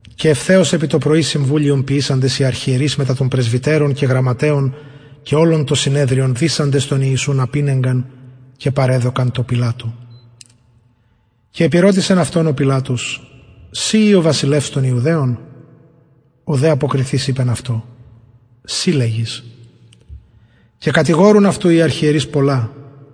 και ευθεως επι το πρωι συμβουλιον ποιησαντες οι αρχιερεις μετα των πρεσβυτερων και γραμματεων και ολον το συνεδριον δησαντες τον ιησουν απηνεγκαν και παρεδωκαν τω πιλατω και επηρωτησεν αυτον ο πιλατος συ ει ο βασιλευς των ιουδαιων ο δε αποκριθεις ειπεν αυτω συ λεγεις και κατηγορουν αυτου οι αρχιερεις πολλα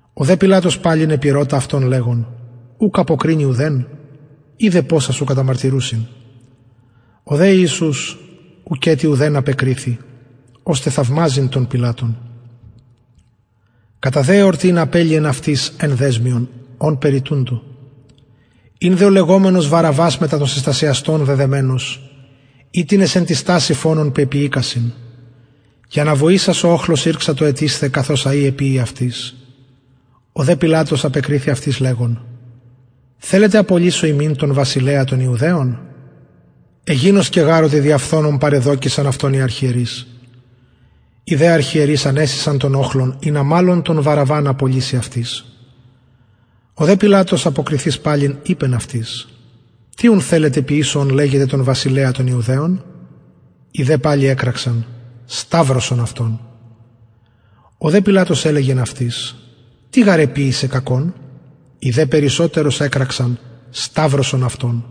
ο δε πιλατος παλιν επηρωτησεν αυτον λεγων ουκ αποκρινη ουδεν ιδε ποσα σου καταμαρτυρουσιν ο δε ιησους ουκετι ουδεν απεκριθη ωστε θαυμαζειν τον πιλατον κατα δε εορτην απελυεν αυτοις ενα δεσμιον ονπερ ητουντο ην δε ο λεγομενος βαραββας μετα των συστασιαστων δεδεμενος οιτινες εν τη στασει φονον πεποιηκεισαν και αναβοησας ο οχλος ηρξατο αιτεισθαι καθως αει εποιει αυτοις ο δε πιλατος απεκριθη αυτοις λεγων θελετε απολυσω υμιν τον βασιλεα των ιουδαιων εγινωσκεν γαρ οτι δια φθονον παραδεδωκεισαν αυτον οι αρχιερεις οι δε αρχιερεις ανεσεισαν τον οχλον ινα μαλλον τον βαραββαν απολυση αυτοις ο δε πιλατος αποκριθεις παλιν ειπεν αυτοις τι ουν θελετε ποιησω ον λεγετε βασιλεα των ιουδαιων οι δε παλιν εκραξαν σταυρωσον αυτον ο δε πιλατος ελεγεν αυτοις τι γαρ κακον εποιησεν οι δε περισσοτερως εκραξαν σταυρωσον αυτον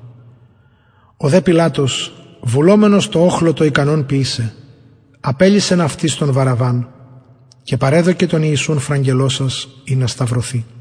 ο δε πιλατος βουλομενος τω οχλω το ικανον ποιησαι απελυσεν αυτοις τον βαραββαν και παρεδωκεν τον ιησουν φραγελλωσας ινα σταυρωθη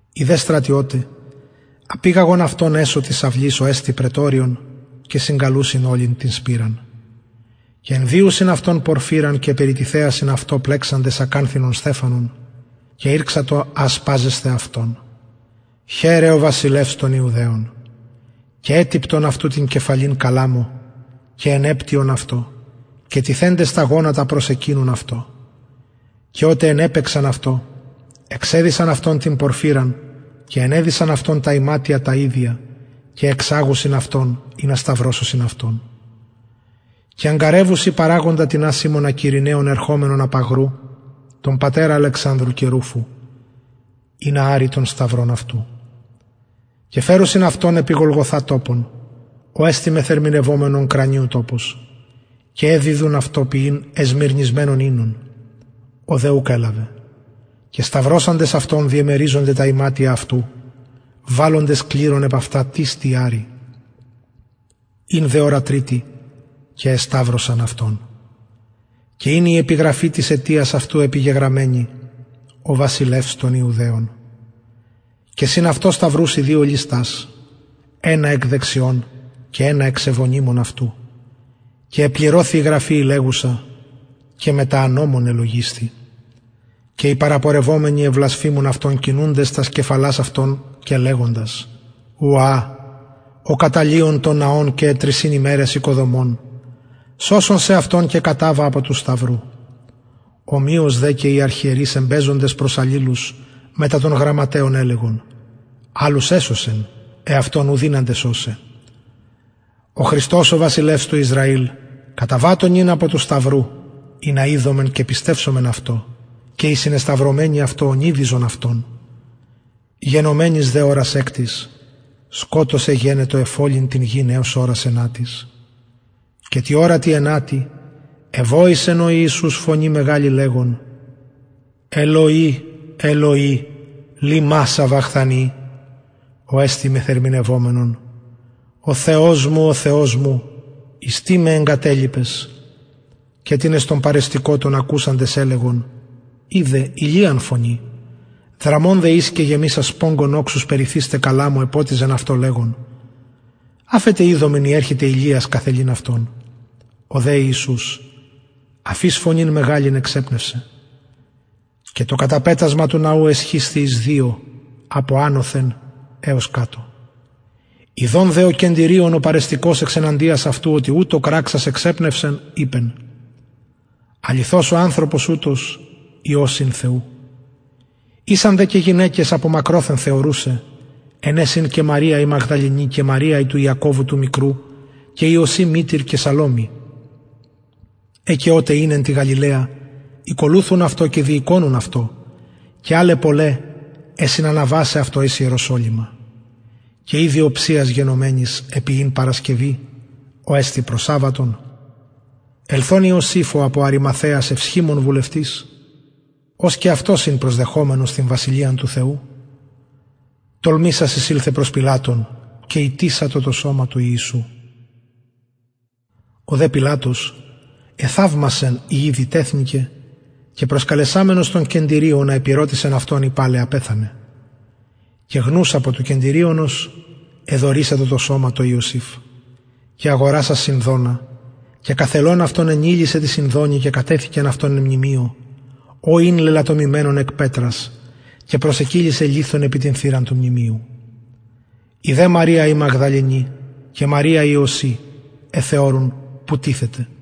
οι δε στρατιωται απηγαγον αυτον εσω της αυλης ο εστιν πραιτωριον και συγκαλουσιν ολην την σπειραν και ενδυουσιν αυτον πορφυραν και περιτιθεασιν αυτω πλεξαντες ακανθινον στεφανον και ηρξαντο ασπαζεσθαι αυτον χαιρε ο βασιλευς των ιουδαιων και ετυπτον αυτου την κεφαλην καλαμω και ενεπτυον αυτω και τιθεντες τα γονατα προσεκυνουν αυτω και οτε ενεπαιξαν αυτω εξεδυσαν αυτον την πορφυραν και ενεδυσαν αυτον τα ιματια τα ιδια και εξαγουσιν αυτον ινα σταυρωσωσιν αυτον και αγγαρευουσιν παραγοντα τινα σιμωνα κυρηναιον ερχομενον απ αγρου τον πατερα αλεξανδρου και ρουφου ινα αρη τον σταυρον αυτου και φερουσιν αυτον επι γολγοθα τοπον ο εστιν μεθερμηνευομενον κρανιου τοπος και εδιδουν αυτω πιειν εσμυρνισμενον οινον ο δε ουκ ελαβεν και σταυρωσαντες αυτον διαμεριζονται τα ιματια αυτου βαλλοντες κληρον επ αυτα τις τι αρη ην δε ωρα τριτη και εσταυρωσαν αυτον και ην η επιγραφη της αιτιας αυτου επιγεγραμμενη ο βασιλευς των ιουδαιων και συν αυτω σταυρουσιν δυο ληστας ενα εκ δεξιων και ενα εξ ευωνυμων αυτου και επληρωθη η γραφη η λεγουσα και μετα ανομων ελογισθη και οι παραπορευομενοι εβλασφημουν αυτον κινουντες τας κεφαλας αυτων και λεγοντες ουα ο καταλυων τον ναον και εν τρισιν ημεραις οικοδομων σωσον σεαυτον και καταβα απο του σταυρου ομοιως και οι αρχιερεις εμπαιζοντες προς αλληλους μετα των γραμματεων ελεγον αλλους εσωσεν εαυτον ου δυναται σωσαι ο χριστος ο βασιλευς του ισραηλ καταβατω νυν απο του σταυρου ινα ιδωμεν και πιστευσωμεν αυτω και οι συνεσταυρωμενοι αυτω ωνειδιζον αυτον γενομενης δε ωρας εκτης σκοτος εγενετο εφ ολην την γην εως ωρας ενατης και τη ωρα τη ενατη εβοησεν ο ιησους φωνη μεγαλη λεγων ελωι ελωι λιμα σαβαχθανι ο εστιν μεθερμηνευομενον ο θεος μου ο θεος μου εις τι με εγκατελιπες και τινες των παρεστηκοτων ακουσαντες ελεγον ιδου ηλιαν φωνει δραμων δε εις και γεμισας σπογγον οξους περιθεις τε καλαμω εποτιζεν αυτον λεγων αφετε ιδωμεν ει ερχεται ηλιας καθελειν αυτον ο δε ιησους αφεις φωνην μεγαλην εξεπνευσεν και το καταπετασμα του ναου εσχισθη εις δυο απο ανωθεν εως κατω ιδων δε ο κεντυριων ο παρεστηκως εξ εναντιας αυτου οτι ουτως κραξας εξεπνευσεν ειπεν αληθως ο ανθρωπος ουτος υιος ην θεου ησαν δε και γυναικες απο μακροθεν θεωρουσαι εν αις ην και μαρια η μαγδαληνη και μαρια η του ιακωβου του μικρου και ιωση μητηρ και σαλωμη αι και οτε ην εν τη γαλιλαια ηκολουθουν αυτω και διηκονουν αυτω και αλλαι πολλαι αι συναναβασαι αυτω εις ιεροσολυμα και ηδη οψιας γενομενης επει ην παρασκευη ο εστιν προσαββατον ηλθεν ιωσηφ ο απο αριμαθαιας ευσχημων βουλευτης ος και αυτος ην προσδεχομενος την βασιλειαν του θεου τολμησας εισηλθεν προς πιλατον και ητησατο το σωμα του ιησου ο δε πιλατος εθαυμασεν ει ηδη τεθνηκεν και προσκαλεσαμενος τον κεντυριωνα επηρωτησεν αυτον ει παλαι απεθανεν και γνους απο του κεντυριωνος εδωρησατο το σωμα τω ιωσηφ και αγορασας σινδονα και καθελων αυτον ενειλησεν τη σινδονι και κατεθηκεν αυτον εν μνημειω ο ην λελατομημενον εκ πετρας και προσεκυλισεν λιθον επι την θυραν του μνημειου η δε μαρια η μαγδαληνη και μαρια ιωση εθεωρουν που τιθεται